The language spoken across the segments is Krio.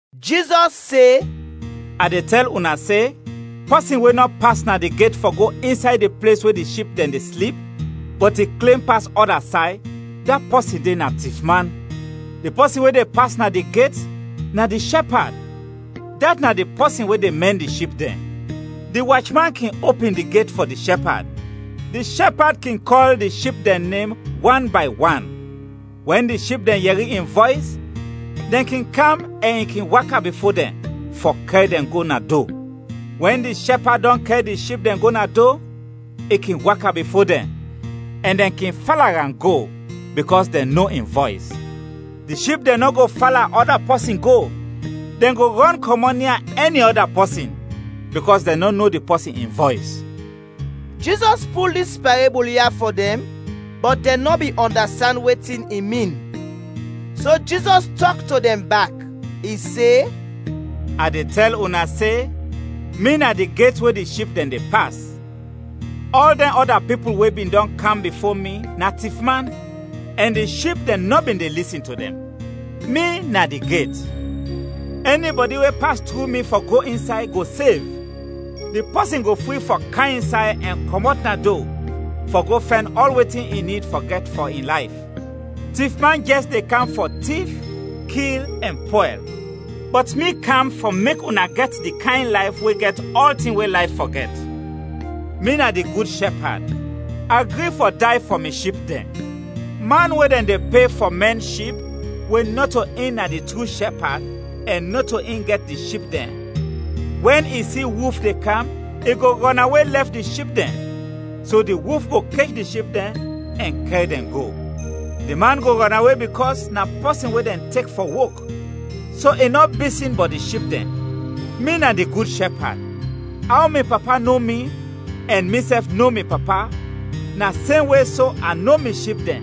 Jizɔs se, “A de tɛl una se, pɔsin we nɔ pas na di get fɔ go insay di ples we di ship dɛn de slip, bɔt i klem pas ɔda say, da pɔsin de na tifman. Di pɔsin we de pas na di get, na di shɛpad, dat na di pɔsin we de mɛn di ship dɛn. Di wachman kin opin di get fɔ di shɛpad, di shɛpad kin kɔl in ship dɛn nem wan bay wan, wɛn di ship dɛn yɛri in vɔys, dɛn kin kam ɛn i kin waka bifo dɛn fɔ kɛr dɛn go na do. Wɛn di shɛpad dɔn kɛr di ship dɛn go na do, i kin waka bifo dɛn, ɛn dɛn kin fala am go, bikɔs dɛn no in vɔys. Di ship dɛn nɔ go fala ɔda pɔsin go, dɛn go rɔn kɔmɔt nia ɛni ɔda pɔsin, bikɔs dɛn nɔ no di pɔsin in vɔys.” Jizɔs pul dis parebul ya fɔ dɛn, bɔt dɛn nɔ bin ɔndastand wetin i min. So Jizɔs tɔk to dɛn bak. I se, “A de tɛl una se: Mi na di get we di ship dɛn de pas. Ɔl dɛn ɔda pipul we bin dɔn kam bifo mi na tifman, ɛn di ship dɛn nɔ bin de lisin to dɛn. Mi na di get. Ɛnibɔdi we pas tru mi fɔ go insay, go sev; di pɔsin go fri fɔ kam insay ɛn kɔmɔt na do fɔ go fɛn ɔl wetin i nid fɔ gɛt fɔ in layf. Tifman jɛs de kam fɔ tif, kil ɛn pwɛl. Bɔt mi kam fɔ mek una gɛt di kayn layf we gɛt ɔltin we layf fɔ gɛt. “Mi na di gud shɛpad, a gri fɔ day fɔ mi ship dɛn. Man we dɛn de pe fɔ mɛn ship, we nɔto in na di tru shɛpad, ɛn nɔto in gɛt di ship dɛn, wɛn i si wulf de kam, i go rɔnawe lɛf di ship dɛn, so di wulf go kech di ship dɛn ɛn kɛr dɛn go. Di man go rɔnawe bikɔs na pɔsin we dɛn tek fɔ wok, so i nɔ bisin bɔt di ship dɛn. Mi na di gud shɛpad. Aw mi Papa no mi, ɛn misɛf no mi Papa, na semwe so a no mi ship dɛn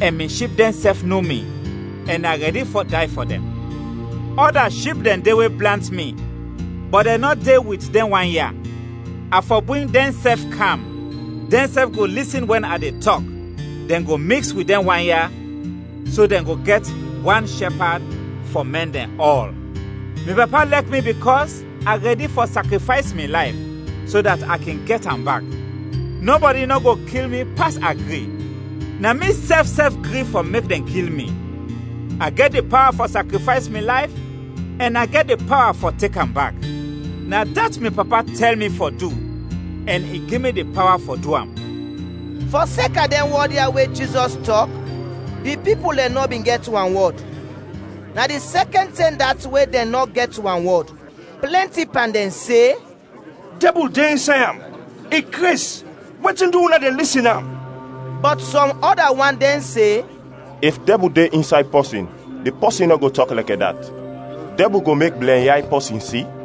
ɛn mi ship dɛnsɛf no mi, ɛn a rɛdi fɔ day fɔ dɛn. Ɔda ship dɛn de we blant mi, bɔt dɛn nɔ de wit dɛn wan ya, a fɔ bring dɛnsɛf kam; dɛnsɛf go lisin wɛn a de tɔk, dɛn go miks wit dɛn wan ya, so dɛn go gɛt wan shɛpad fɔ mɛn dɛn ɔl. “Mi Papa lɛk mi bikɔs a rɛdi fɔ sakrifays mi layf, so dat a kin gɛt am bak. Nɔbɔdi nɔ go kil mi pas a gri. Na misɛf sɛf gri fɔ mek dɛn kil mi. A gɛt di pawa fɔ sakrifays mi layf ɛn a gɛt di pawa fɔ tek am bak. Na dat mi Papa tɛl mi fɔ du ɛn i gi mi di pawa fɔ du am.” Fɔseka dɛn wɔd ya we Jizɔs tɔk, di pipul dɛn nɔ bin gɛt wanwɔd. Na di sɛkɛn tɛm dat we dɛn nɔ gɛt wanwɔd. Plɛnti pan dɛn se, “Dɛbul de insay am! I kres! Wetin du una de lisin am!” Bɔt sɔm ɔda wan dɛn se, “If dɛbul de insay pɔsin, di pɔsin nɔ go tɔk lɛkɛ dat! Dɛbul go mek blɛnyay pɔsin si?”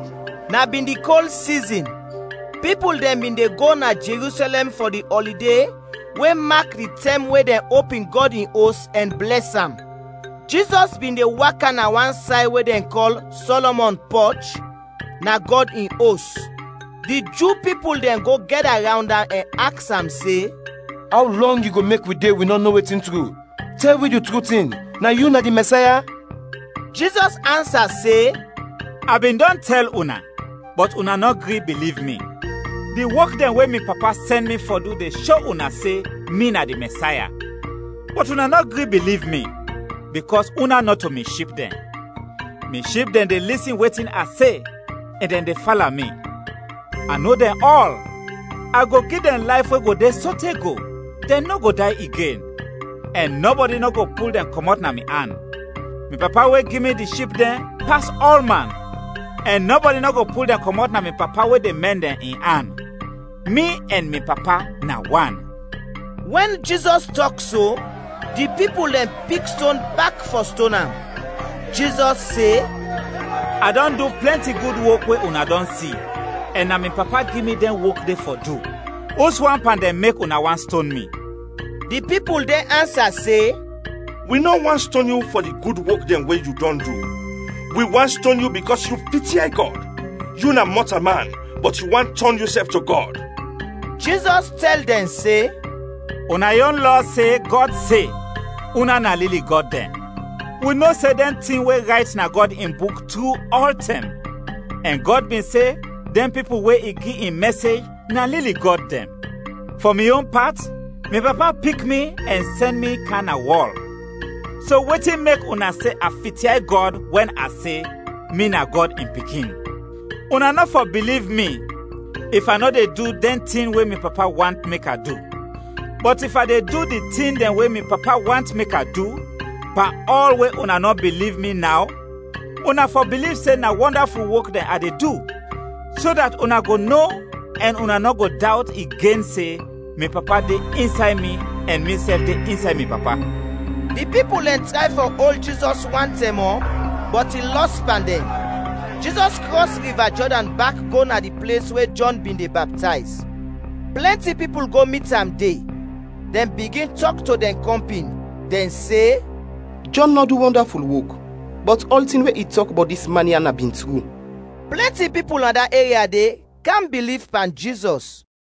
Na bin di kol sizin, pipul dɛn bin de go na Jerusɛlɛm fɔ di ɔlide we mak di tɛm we dɛn opin Gɔd in Os ɛn blɛs am. Jizɔs bin de waka na wan say we dɛn kɔl “Sɔlɔmɔn Pɔch,” na Gɔd in Os. Di Ju pipul dɛn go gɛda rawnd am ɛn aks am se, “Aw lɔng yu go mek wi de, wi nɔ no wetin tru? Tɛl wi di tru tin, na yu na di Mɛsaya?” Jizɔs ansa se, “A bin dɔn tɛl una, bɔt una nɔ gri biliv mi. Di wok dɛn we mi Papa sɛn mi fɔ du de sho una se mi na di Mɛsaya; bɔt una nɔ gri biliv mi, bikɔs una nɔto mi ship dɛn. Mi ship dɛn de lisin wetin a se, ɛn dɛn de fala mi. A no dɛn ɔl. A go gi dɛn layf we go de sote go, dɛn nɔ go day igen, ɛn nɔbɔdi nɔ go pul dɛn kɔmɔt na mi an. Mi Papa we gi mi di ship dɛn, pas ɔlman, ɛn nɔbɔdi nɔ go pul dɛn kɔmɔt na mi Papa, we de mɛn dɛn, in an. Mi ɛn mi Papa na wan.” Wɛn Jizɔs tɔk so, di pipul dɛn pik ston bak fɔ ston am, Jizɔs se, “A dɔn du plɛnti gud wok we una dɔn si, ɛn na mi Papa gi mi dɛn wok de fɔ du. Uswan pan dɛn mek una want ston mi?” Di pipul dɛn ansa se, “Wi nɔ want ston yu fɔ di gud wok dɛn we yu dɔn du, wi want ston yu bikɔs yu fityay Gɔd. Yu na mɔtalman bɔt yu want tɔn yusɛf to Gɔd!” Jizɔs tɛl dɛn se, “Una yon Lɔ se, Gɔd se, ‘Una na lili gɔd dɛn.’ Wi no se dɛn tin we rayt na Gɔd in Buk tru ɔltɛm; ɛn Gɔd bin se dɛn pipul we i gi in mɛsej, na lili gɔd dɛn. Fɔ mi yon pat, mi Papa pik mi ɛn sɛn mi kam na wɔl, so wetin mek una se a fityay Gɔd wɛn a se, mi na Gɔd in Pikin? Una nɔ fɔ biliv mi if a nɔ de du dɛn tin we mi Papa want mek a du. Bɔt if a de du di tin dɛn we mi Papa want mek a du, pan ɔl we una nɔ biliv mi naw, una fɔ biliv se na wɔndaful wok dɛn a de du, so dat una go no ɛn una nɔ go dawt igen se mi Papa de insay mi ɛn misɛf de insay mi Papa.” Di pipul dɛn tray fɔ ol Jizɔs wan tɛm mɔ, bɔt i lɔs pan dɛn. Jizɔs krɔs Riva Jɔdan bak go na di ples we Jɔn bin de baptayz. Plɛnti pipul go mit am de. Dɛn bigin tɔk to dɛn kɔmpin, dɛn se, “Jɔn nɔ du wɔndaful wok, bɔt ɔltin we i tɔk bɔt dis man ya na bin tru.” Plɛnti pipul na da eria de kam biliv pan Jizɔs.